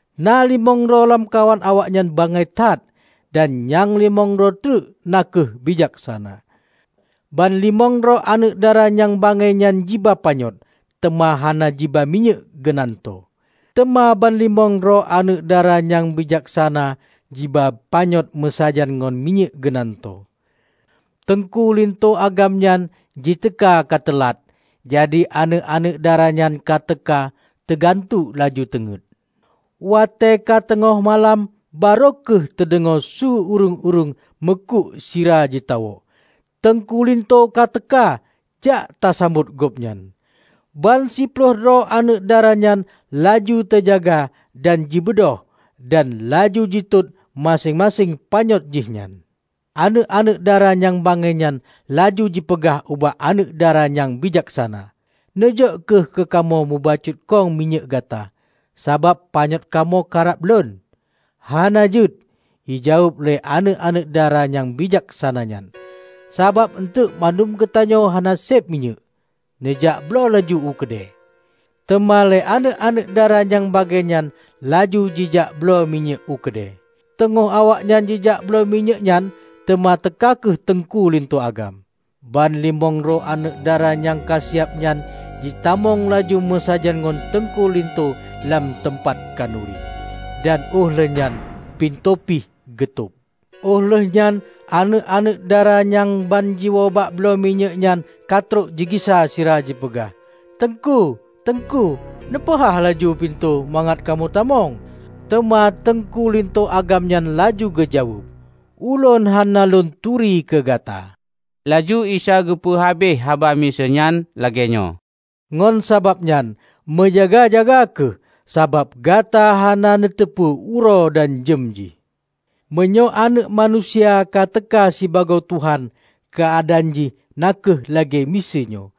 Na limong droe lamkawan awaknyan bangai that, dan nyang limong droe treuk na kheueh bijaksana. Ban limong droe aneuëk dara nyang bangai nyan jiba panyöt, teuma hana jiba minyéuk geunantoe. Teuma ban limong droe aneuëk dara nyang bijaksana jiba panyöt meusajan ngon minyéuk geunantoe. Teungku linto agam nyan jiteuka ka teulat, jadi aneuëk-aneuëk dara nyan ka teuka teugantuek laju teungét. Watée ka teungoh malam barô kheueh teudeungoe su ureuëng meukuk sira jitawök, 'Teungku linto ka teuka! Jak ta sambot gobnyan!' Ban siploh droe aneuëk dara nyan laju teujaga dan jibeudôh, dan laju jitot maséng-maséng panyöt jihnyan. Aneuëk-aneuëk dara nyang bangai nyan laju jipeugah ubak aneuëk dara nyang bijaksana, 'Neujok kheueh keu kamoe mubacut khong minyéuk gata, sabab panyöt kamoe karab lon.' 'Hana jeuet!' jijaweueb lé aneuëk-aneuëk dara nyang bijaksana nyan, 'sabab eunteuk bandum geutanyoe hana seb minyéuk. Neujak bloe laju u keudée.' Teuma lé aneuëk-aneuëk dara nyang bangai nyan laju jijak bloe minyéuk u keudée. Teungoh awaknyan jijak bloe minyéuk nyan, teuma teuka kheueh teungku linto agam. Ban limong droe aneuëk dara nyang ka siab nyan jitamong laju meusajan ngon teungku linto lam teumpat khanuri, dan óh lheueh nyan pintoe pih geutob! Óh lheueh nyan aneuëk-aneuëk dara nyang ban jiwoe jak bloe minyéuk nyan ka trok jigisa sira jipeugah, 'Teungku-teungku, neupeuhah laju pintoe mangat kamoe tamong.' Teuma teungku linto agam nyan laju geujaweueb, 'Ulôn hana Lôn turi keu gata!' " Laju Isa geupeu habéh haba miseue nyan lagée nyoe, "Ngon sabab nyan meujaga-jaga kheueh, sabab gata hana neuteupeue uroe dan jeuem jih." "Meunyoe Aneuëk Manusia ka teuka sibagoe Tuhan keuadaan jih na kheueh lagée miseue nyoe.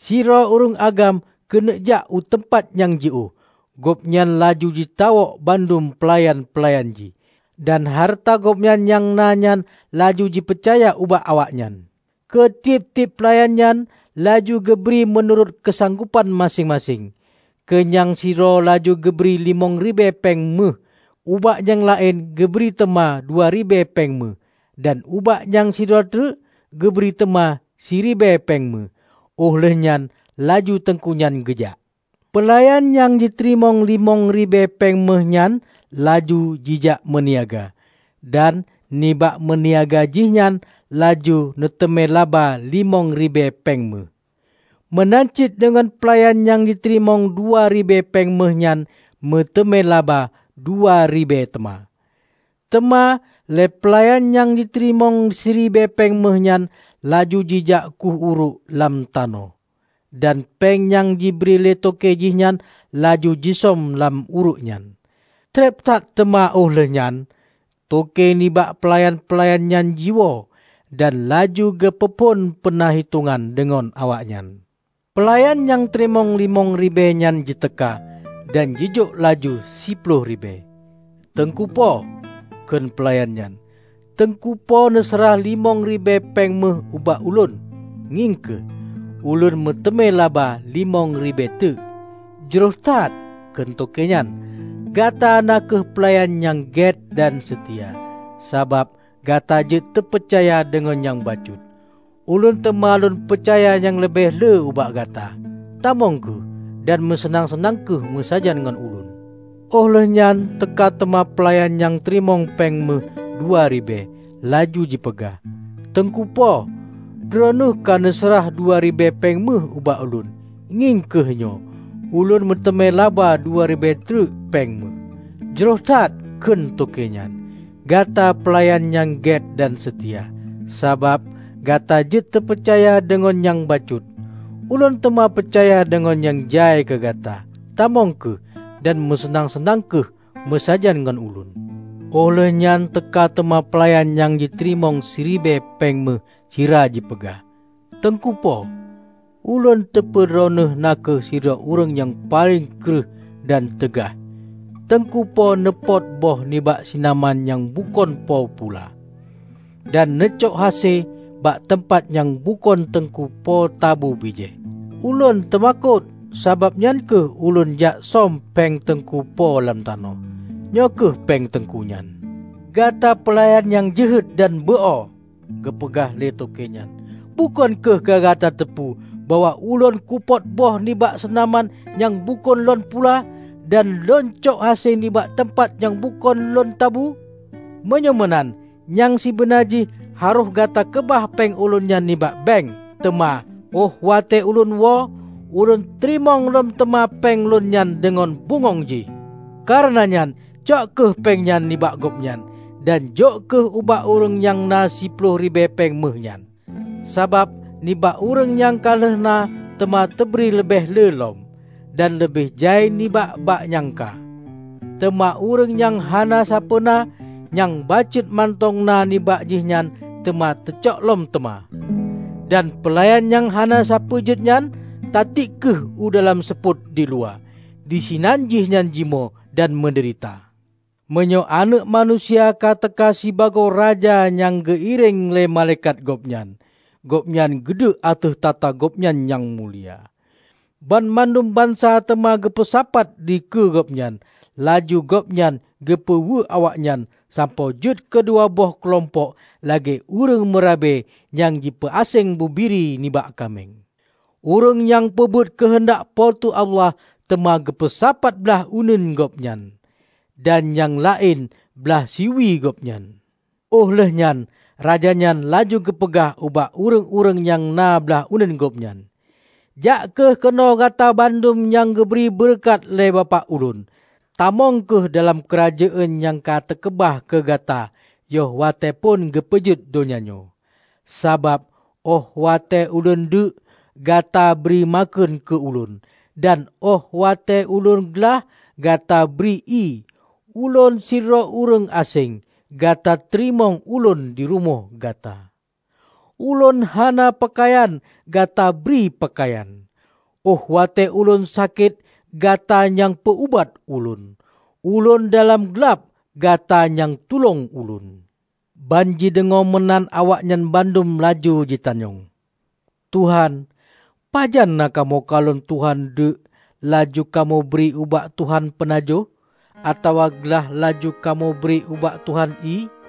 Sidroe ureuëng agam keuneuk jak u teumpat nyang jiôh. Gobnyan laju jitawök bandum peulayan-peulayan jih, dan hareuta gobnyan nyang na nyan laju jipeucaya ubak awaknyan. Keu tieb-tieb peulayan nyan laju geubri meunurot keusanggopan maséng-maséng. Keu nyang sidroe laju geubri limong ribée péng méuh. Ubak nyang laén geubri teuma dua ribée péng méuh. Dan ubak nyang sidroe trek geubri teuma siribée péng méuh. Óh lheueh nyan laju teungku nyan geujak. Peulayan nyang jiteurimong limong ribée péng méuh nyan laju jijak meuniaga, dan nibak meuniaga jih nyan laju neuteumé laba limong ribée péng méuh. Meunan cit deungon peulayan nyang jiteurimong dua ribée péng méuh nyan meuteumé laba dua ribée teuma. Teuma lé peulayan nyang jiteurimong siribée péng méuh nyan laju jijak khueh uruek lam tanoh, dan péng nyang jibri lé toke jih nyan laju jisöm lam uruek nyan. Treb that teuma óh lheueh nyan, toke nibak peulayan-peulayan nyan jiwoe, dan laju geupeu phon peuna hitongan deungon awaknyan. Peulayan nyang teurimong limong ribée nyan jiteuka, dan jijok laju siploh ribée. 'Teungku po,' kheun peulayan nyan, 'Teungku po neuseurah limong ribée péng méuh ubak ulôn. Ngieng kheueh, ulôn meuteumé laba limong ribée teuk.' 'Jroh that,' kheun toke nyan, 'gata na kheueh peulayan nyang gét dan seutia. Sabab gata jeuet teupeucaya deungon nyang bacut, ulôn teuma lôn peucaya nyang leubeh le ubak gata. Tamong kheueh dan meuseunang-seunang kheueh meusajan ngon ulôn!' Óh lheueh nyan teuka teuma pelayan nyang teurimong péng méuh dua ribée, laju jipeugah, 'Teungku po, droeneueh ka neuseurah dua ribée péng méuh ubak ulôn. Ngieng kheueh nyoe, ulôn meuteumé laba dua ribée treuk péng méuh.' 'Jroh that,' kheun toke nyan, 'gata peulayan nyang gét dan seutia. Sabab gata jeuet teupeucaya deungon nyang bacut, ulôn teuma peucaya deungon nyang jai keu gata. Tamong kheueh dan meuseunang-seunang kheueh meusajan ngon ulôn!' Óh lheueh nyan teuka teuma peulayan nyang jiteurimong siribée péng méuh sira jipeugah, 'Teungku po, ulôn teupeu droeneueh na kheueh sidroe ureuëng nyang paleng kreueh dan teugaih. Teungku po neupot boh nibak sinaman nyang bukon po pula, dan neucok hase bak teumpat nyang bukon teungku po tabu bijéh. Ulôn teumakot, sababnyan kheueh ulôn jaksöm péng teungku po lam tanoh. Nyoe kheueh péng teungku nyan.' 'Gata peulayan nyang jeuhet dan beu-o!' geupeugah lé toke nyan. 'Bukon kheueh ka gata teupeu bahwa ulôn kupot boh nibak seunaman nyang bukon lôn pula, dan lôn cok hase bak teumpat nyang bukon ulôn tabu? Meunyoe meunan, nyang sibeuna jih harôh gata keubah péng ulôn nyan nibak bank, teuma óh watée ulôn woe, ulôn teurimong lom teuma péng lôn nyan deungon bungöng jih. Kareuna nyan, cok kheueh péng nyan nibak gobnyan, dan jok kheueh ubak ureuëng nyang na siploh ribée péng méuh nyan. Sabab, nibak ureuëng nyang ka lheueh na, teuma teubri leubeh le lom, dan leubeh jai nibak bak nyang ka. Teuma ureuëng nyang hana sapeue na, nyang bacut mantong na nibak jihnyan teuma teucok lom teuma. Dan peulayan nyang hana sapeue jeuet nyan, tatiek kheueh u dalam seupôt diluwa. Disinan jihnyan jimoe dan meudeurita!' " "Meunyoe Aneuëk Manusia ka teuka sibagoe raja nyang geu-iréng lé malaikat Gobnyan, Gobnyan geuduek ateueh takhta Gobnyan nyang mulia. Banmandum bansa teuma geupeusapat dikeue Gobnyan. Laju Gobnyan geupeu weuek awaknyan sampoe jeuet keu dua boh keulompok lagée ureuëng meurabe nyang jipeu aséng bubiri nibak kaméng. Ureuëng nyang peubuet keuheundak Po teu Allah teuma geupeusapat blaih uneuen Gobnyan, dan nyang laén blaih si uwie Gobnyan. Óh lheueh nyan raja nyan laju geupeugah ubak ureuëng-ureuëng nyang na blaih uneuen Gobnyan, 'Jak kheueh keunoe gata bandum nyang geubri beureukat lé Bapak Ulôn. Tamong kheueh dalam Keurajeuen nyang ka teukeubah keu gata yoh watée phon geupeujeuet donya nyoe. Sabab óh watée Ulôn deuek, gata bri makheun keu Ulôn, dan óh watée Ulôn glah, gata bri ié. Ulôn sidroe ureuëng aséng, gata teurimong Ulôn di rumoh gata. Ulôn hana peukayan, gata bri peukayan. Óh watée Ulôn sakét, gata nyang peu-ubat Ulôn. Ulôn dalam glab, gata nyang tulông Ulôn.' Ban jideungoe meunan awaknyan bandum laju jitanyong, 'Tuhan, pajan na kamoe kalon Tuhan deuek laju kamoe bri ubak Tuhan peunajoh, atawa glah laju kamoe bri ubak Tuhan ié?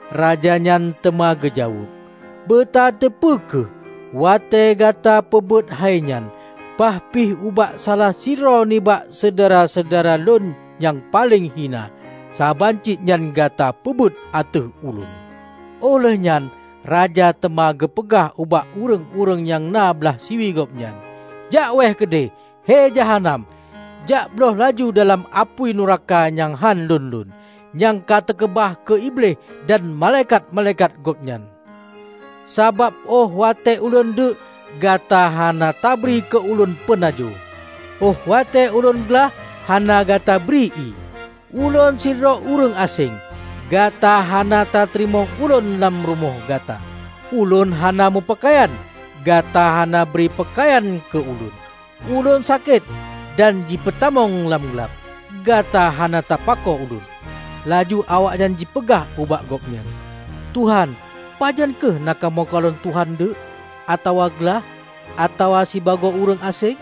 Raja nyan teuma geujaweueb, 'Beutateupeu kheueh: watée gata peubuet hai nyan, bahpih ubak salah sidroe nibak syedara-syedara Lôn nyang paleng hina, saban cit nyan gata peubuet ateueh Ulôn!' Óh lheueh nyan raja teuma geupeugah ubak ureuëng-ureuëng nyang na blaih siwie Gobnyan, 'Jak wéeh keudeh, he jahanam! Jak blôh laju dalam apui nuraka nyang hán lon-lon, nyang ka teukeubah keu iblih dan malaikat-malaikat gobnyan! Sabab óh watée Ulôn deuek, gata hanatabri keu Ulôn peunajoh; óh watée Ulôn glah, hana gata bri ié. Ulôn sidroe ureuëng aséng, gata hana tateurimong Ulôn lam rumoh gata. Ulôn hana meupeukayan, gata hana bri peukayan keu Ulôn. Ulôn sakét dan jipeutamong lam glab, gata hana tapako Ulôn.' Laju awaknyan jipeugah ubak Gobnyan, 'Tuhan, pajan kheueh na kamoe kalon Tuhan deuek, atawa glah, atawa sibagoe ureuëng aséng,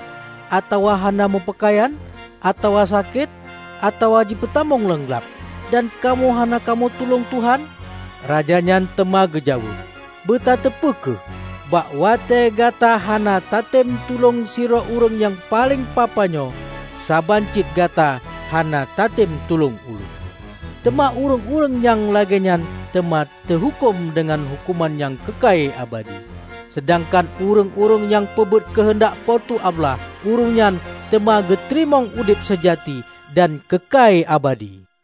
atawa hana meupeukayan, atawa sakét, atawa jipeutamong lam glab, dan kamoe hana kamoe tulông Tuhan?' Raja nyan teuma geujaweueb, 'Beutateupeu kheueh: bak watée gata hana tatem tulông sidroe ureuëng nyang paleng papa nyoe, saban cit gata hana tatem tulông Ulôn.' Teuma ureuëng-ureuëng nyang lagée nyan teuma teuhuköm deungon huköman nyang keukai abadi, seudangkan ureuëng-ureuëng nyang peubuet keuheundak Po teu Allah ureuëng nyan teuma geuteurimong udeb seujati dan keukai abadi."